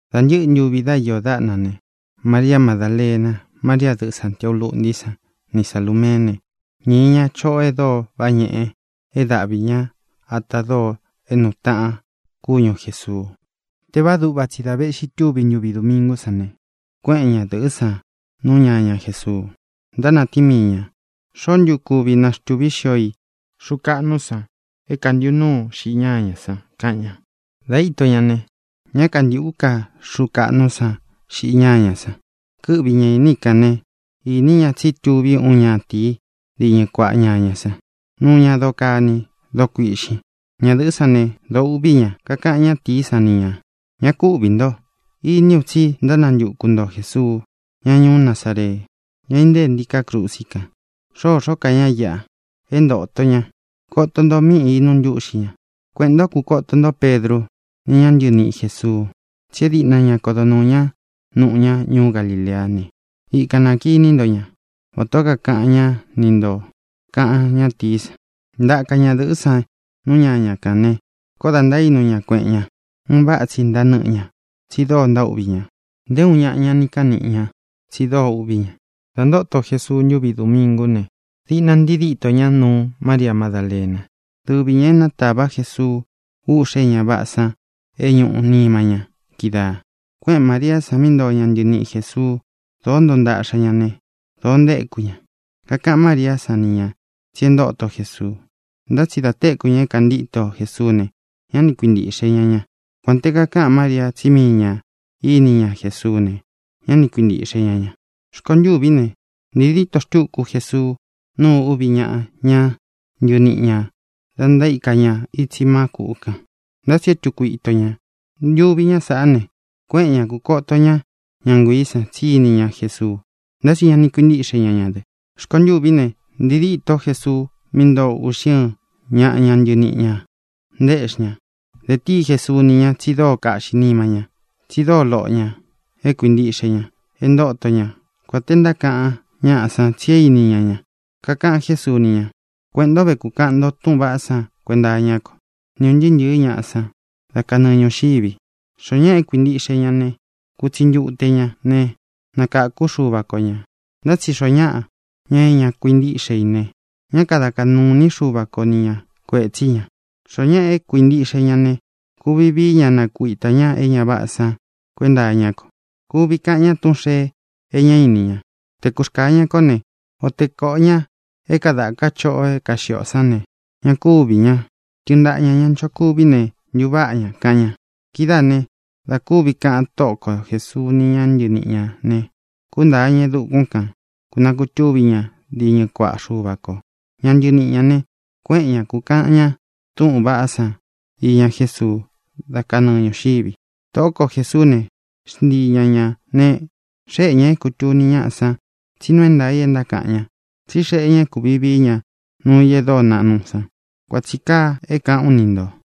Dā ntɨ́ꞌɨ ntuvi dá iō dáꞌna ne, Maria Madálena, María, dɨꞌɨ Sāntiau lúꞌntī sán, ni Salūmeé ne, ñīi ña choꞌo e dóo váꞌa ñeꞌe é daꞌvi ña ata dóo é nuu taꞌan kúñu Jēsuu. Tēvaá duꞌva tsi da véꞌxi tuví ntuvi domingú san ne, kuéꞌen ñadɨ̄ꞌɨ́ san nú ñaña Jēsuu. Ntánatíin mii ñā: —¿Xoó ntu kuvi naxtuvī xio i xuu kaꞌnú san é kantīꞌu núu xiꞌi ñáñā san? —kaꞌan ña. Dā íto ña ne, ñá kantīꞌú ka xuu kaꞌnú san xiꞌi ñáñā san. Kɨ́ꞌvi ña īní i kān né, īní ña tsí tuví uun ñatīí diñɨ kuaꞌa ñañā san. Nuu ña doo kani, doo kuiꞌxin. Ña dɨ̄ꞌɨ́ san ne, dōo uꞌví ña. Kakaꞌan ñátīí san ni ñā: —Ñá ku uꞌvī nto. Iní u tsí ntánantuku nto Jēsuu, ña ñuú Nazaree, ña é intée ntiká krusi kan. Xôxó ka ña íꞌa. É ntōto ña. Koto nto mí inuu ntúꞌxi ña. Kueꞌēn ntó, kukoto nto Pedrú, ni ña ntɨniꞌi Jēsuu, tsí e díꞌna ña kodo nuū ñá nuꞌu ñá ñuú Galileá ne, ikan nakinī ntó ña, vatā ó kākaꞌan ñá ni ntō —kaꞌan ñátīí san. Ntaka ñadɨ̄ꞌɨ́ san nú ñaña kān ne, koó dā ntaínu ña kueꞌen ña. Un váꞌa tsi ntanɨ́ꞌɨ ña, tsi dóo ntaúꞌvī ña. Nté uun ñaꞌa ña ni kaꞌan níꞌi ña, tsi dóo uꞌví ña. Dā ntóto Jesuu ntuvi domingú ne, diꞌna ntii dítō ña nuu Mária Madálena, dɨvi ñā é natāva Jesuu úꞌxē é ña váꞌā san é ñūꞌu nima ña kídaā. Kuéꞌen Māriá san mí ntoo ña ntɨniꞌi Jēsuu. Dōó ntoo ntaꞌxa ña ne, dōo ntaéku ña. Kakaꞌan María san ni ña tsí e ntóto Jesuu. Ntá tsi da téku ña é kāntíto Jesuú ne, ñá ni kuintīꞌxe ña ña. Kuān te kakáꞌan María tsí mii ñā íni ña Jesuú ne, ñá ni kuintīꞌxe ña ña. Rkontûví ne, ntii dîto xtúku Jesuu nuu uvi ñáꞌa ña ntɨniꞌi ñā da ntaíka ña itsi má kuꞌu kān, ntá tsi e túku ito ña. Ntuvi ñá sāꞌá ne, kuéꞌen ña, kūkóto ña ña nguiī sán tsi íni ña Jesuu. Ntá tsi ña ni kuintíꞌxe ña ña dɨ. Rkontûví ne, ntīi dîtó Jesuu mí ntoo uꞌxi ɨ́ɨn ñaꞌa ña ntɨniꞌi ñā, ntaéꞌxi ña. Dē tíi Jesuu ni ña tsi dóo kaꞌxī nima ñá, tsi dóo loꞌo ñā é kuintiꞌxe ña e ntóto ña, kuān te ntákaꞌan ñáꞌa san tsí é īní ña ña. Kakaꞌan Jésuu ni ña: —Kueꞌēn ntó ve, kukaꞌan nto túꞌūn vaꞌá san kuenta iñá ko ni ūn ntɨɨ́ ntɨ̄ɨ́ ñaꞌa san dá kanɨɨ ñūxivi. Xoó ñaꞌa é kuintiꞌxe ña ne kutsi ntute ña ne, nakākú Xúva ko ñā. Ntá tsi xoó ñaꞌa, ña é ña kuintíꞌxe i ne, ñá kada kaꞌnū iní Xuva ko ni ña kuētsí ña. Xoó ñaꞌa é kuintiꞌxe ña ne, kuvi vií ña nakuitā ñá e ña váꞌā san kuenta iñá ko. Kuvi kaꞌan ña túꞌūn xee e ñá ini ña. Te kurkāa ña koó ne, o te kōꞌo ña é kadāka choꞌo é kaxiꞌi ó san ne, ña kúvī ña. Tɨɨn ntaꞌa ñā ña nchokuví ne, ntuváꞌa ña —kaꞌan ña. Kidáā né, dā kúvi kaꞌan Tóꞌo ko Jēsuu ni ña ntɨníꞌi ñā ne, kúntāa ña e dukún kān, kunakutúvi ña diñɨ kuaꞌa Xuva kō. Ña ntɨniꞌi ñā ne, kuéꞌen ña, kūkaꞌan ña túꞌūn vaꞌá san iña Jésuu dá kanɨɨ ñūxivi. Tōꞌó ko Jēsuú ne, xntii ña ñā ne, xéꞌe ñā é kūtuni ñáꞌa san tsí nuu é ntaā i é ntákaꞌan ñá, tsi xéꞌe ñā é kūvi vií ña nuu i e dóo naꞌnu san. Kuan tsī kaa é kāꞌán u ni ntō.